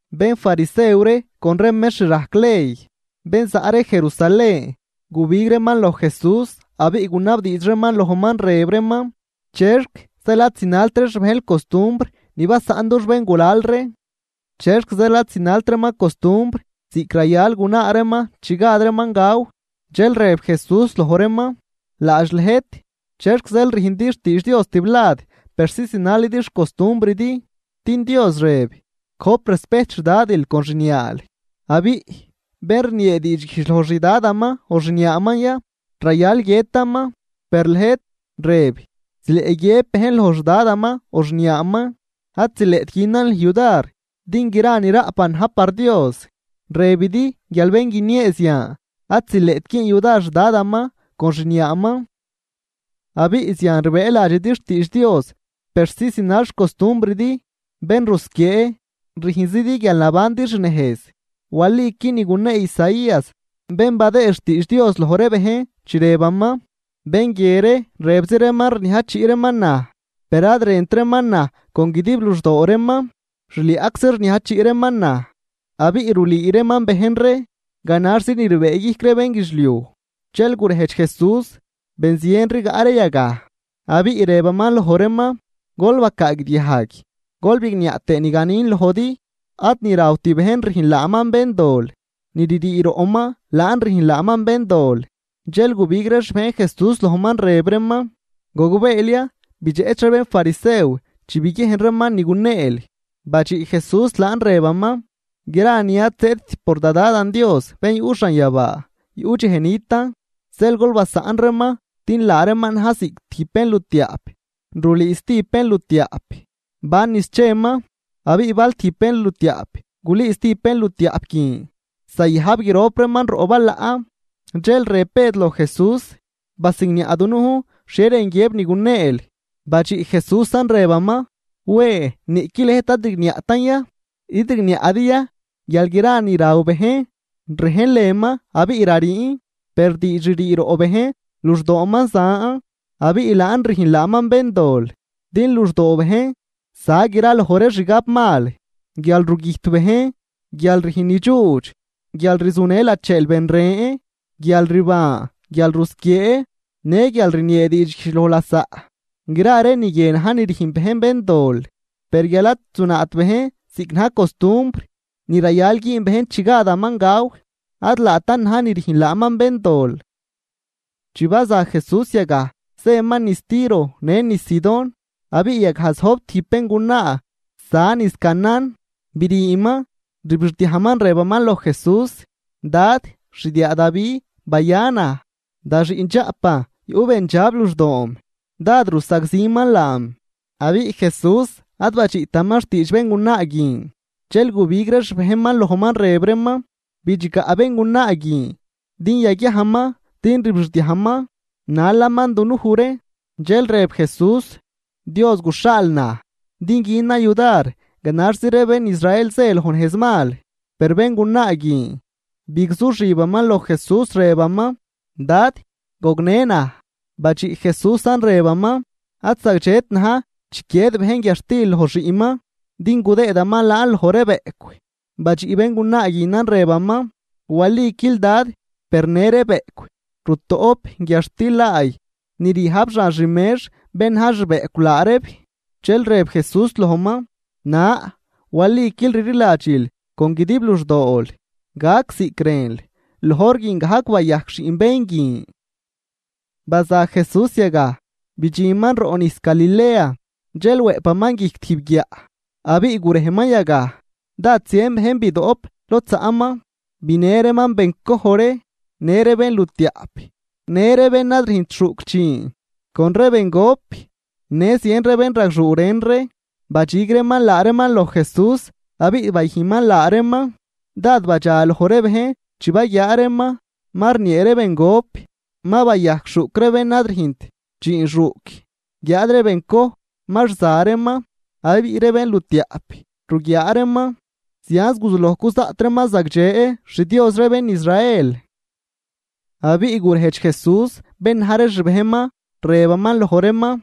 Bénfarisew ree con ree mextr rajc ley, bén za ree Jerusalén, gubig reeman loj Jesús abiꞌ gunabdiidx reeman lojman, rëb reeman ―¿Chexc zeel ad zinalt ree xbejnl costumbr ni basaꞌn dux béngulal ree? ¿Chexc zeel ad zinalt reeman costumbr ziꞌc rayal gunaa reeman chi gad reeman gaw? Dxel rëb Jesús loj reeman: ―Laadx lëjt, ¿chexc zeel rüjndi xtiidx Dios tiblad persi zinal xcostumbridi? Din Dios rëb: “Gojp respejt xDadil con xniaal”, abiꞌ “Bén rniee diidxguijdx loj xdadaman o xniaaman ya, rayal guiëtaman.” Per lëjt rëb zileꞌ guiëb bejn loj xdadaman o xniaaman: “Ad zileꞌt günan lüj yudar, din gra ni raꞌpan na̱j par Dios.” Rëbidi guial bén guiniee zian, ad zileꞌt güün yudar xdadaman con xniaaman, abiꞌ zian rbëëladxidi xtiidx Dios persi zinal xcostumbridi. ¡Bén rusquiee! ¡Rüjnzidi guial nabandi xnejz! Waliqui ni gunee Isaías, bén badëë xtiidx Dios loj ree bejn, chi rëbaman: Bén guie ree rëbzi reeman rniajchiꞌ reeman naj, per ad rënt reeman naj con guidib luxdoo reeman. Xliaꞌczi rniajchiꞌ reeman naj, abiꞌ rulüü reeman bejn ree ganaxzi ni rbëëguijc ree bénguidxliuj. Dxel gurejdx Jesús ben zien rigaꞌ ree yagaj, abiꞌ rëbaman loj reeman: ―Gol bacaagdiajg, gol bigniaꞌ tëë ni ganin lojdi. Ad ni rawt bejn rüjn laaman béndol, ni ririi roꞌman laan rüjn laaman béndol. Dxel gubig ree xbejn Jesús lojman, rëb reeman: ―¿Gogbeel ya bidxeꞌch ree bénfarisew chi biguiejn reeman ni guneel? Badxiꞌ Jesús laan rëbaman: ―Gra ni ad zëëdt por da Dadan Dios bén yuꞌ xanyabaa, yuꞌ dxej nitan. Zeel gol basaꞌn reeman din laa reeman na̱j ziꞌc tijb bénlutiaꞌp rulüü stijb bénlutiaꞌp ban niz cheman. Abiꞌ bal tijb bénlutiaꞌp gulüü stijb bénlutiaꞌp guin, zayajb grop reeman roꞌ balaꞌ. Dxel rëb Bëd loj Jesús: ―¿Basigniaꞌ dunujn xhie rën guiëb ni guneel? Badxiꞌ Jesúsan rëbaman: ―¿Wen, niꞌqui lëjt ad rigniaꞌtan ya? ¿Id rigniaꞌdi ya guial gra ni raw bejn rej lënman abiꞌ rariin? Per diidx ririi roꞌ bejn, luxdooman zan, abiꞌ laan rüjn laaman béndol. Din luxdoo bejn za graloj ree xgabmal, guialrugüjt bejn, guial rüjn nidxuudx, guialrzunë lacheel ben ren, guialrban, guialrusquiee në guialrniee diidxguijdx loj lasaꞌ. Gra ree ni guie na̱j ni rüjn bejn béndol. Per guial ad zunaat bejn ziꞌc na̱j costumbr ni rayal güün bejn chi gadaman gaw, ad laatan na̱j ni rüjn laaman béndol. Chi baza Jesús yagaj zëman niz Tiro në niz Sidón. Abiꞌ yagaj zojb tijb béngunaa za niz Canaán, briiman, rbixdiajman rëbaman loj Jesús: ―¡Dad, xdiaa Davi, baya naj! Da xiꞌndxaꞌpan yuꞌ bendxab luxdoom, dád rusagziman laam. Abiꞌ Jesús ad badxiꞌtaman xtiidx béngunaa guin. Dxel gubig ree xbejnman lojman, rëb reeman: ―Bidxgaꞌ béngunaa guin, din yaguiajman, din rbixdiajman nalaman dunuj ree. Dxel rëb Jesús: ―Dios guxhaal naj din günan yudar ganaxzi ree bén Israel zë loj nejz mal. Per béngunaa guin bigzuxibaman loj Jesús, rëbaman: ―¡Dad, gognë naj! Badxiꞌ Jesúsan, rëbaman: ―Ad zagdxet na̱j chiquied bejn guiadxtil loj xiꞌnman din gudëëdaman laan loj ree bëꞌcw. Badxiꞌ béngunaa guinan, rëbaman: ―Waliquil, Dad, per në ree bëꞌcw rutoꞌp guiadxtil laay ni ryajb xan xmex bén na̱j xbëꞌcw laa reeb. Dxel rëb Jesús lojman: ―¡Na, waliquil rliladxil con guidib luxdool! Gac ziꞌc rënl. Loj hor guin gajc bayajc xiꞌn bén guin. Baza Jesús yagaj, bidxinman roꞌ nijs Galilea, dxel wëꞌpaman guijc tijb guiaꞌ abiꞌ gurejman yagaj. Dád zien bejn bidoꞌp lod zaꞌman. Binë reeman bencoj ree, në ree bénlutiaꞌp, në ree bén ad rüjnt xuꞌc dxiin, con ree bengop në zien ree bénragxuu ren ree, badxig reeman laa reeman loj Jesús, abiꞌ bayüjnman laa reeman. Dád badxa loj ree bejn chi baguiaa reeman ma rniee ree bengop, ma bayajc xuꞌc ree bén ad rüjnt dxiin xuꞌc, guiáad ree bencoj ma rza reeman abiꞌ ree bénlutiaꞌp ruguiaa reeman. Zianz guzuloj cuzaꞌt reeman zagdxe xDios ree bén Israel. Abiꞌ gurejdx Jesús bén na̱j ree xbejnman, rëbaman loj reeman: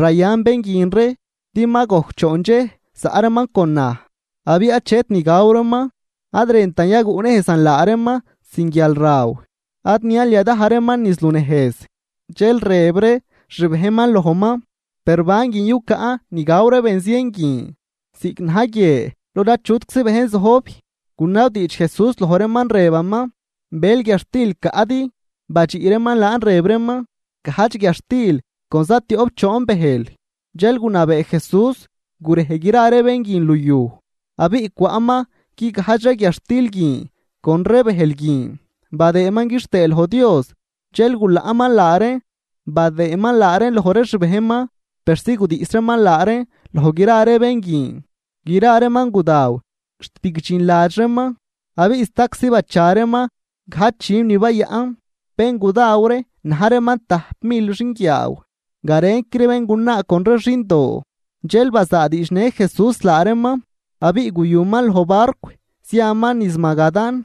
―Rayan bén guin ree, din ma gojc choon dxej zaꞌ reeman con naj, abiꞌ achet ni gaw reeman. Ad rëntan yaguꞌnejzan laa reeman sin guialraw ad nial yadaj reeman niz lunejz. Dxel rëb ree xbejnman lojman: ―Per ¿ban guin yucaꞌn ni gaw ree benzien guin, ziꞌc na̱j guie lod achutczi bejn zojb? Gunabdiidx Jesús loj reeman, rëbaman: ―¿Bël guiadxtil caꞌdi? Badxiꞌ reeman laan rëb reeman: ―Gajdx guiadxtil con zatioꞌp choon bëjl. Dxel gunabee Jesús gurej gra ree bén guin luyuj. Abiꞌ cwaꞌman guigajdx ree guiadxtil guin con ree bëjl guin, badëëman quixtëë loj Dios. Dxel gulaꞌman laa reen, badëëman laa reen loj ree xbejnman persi gudiꞌs reeman laa reen loj gra ree bén guin. Gra reeman gudaw xt bigdxinladx reeman. Abiꞌ staczi bacha reeman gajdx dxüm ni bayaꞌn. Bén gudaw ree na̱j reeman tajp mil xinguiaaw, garenqui ree béngunaa con ree xindoo. Dxel bazaadiidxnë Jesús laa reeman, abiꞌ guyuman loj barcw ziaman niz Magadán.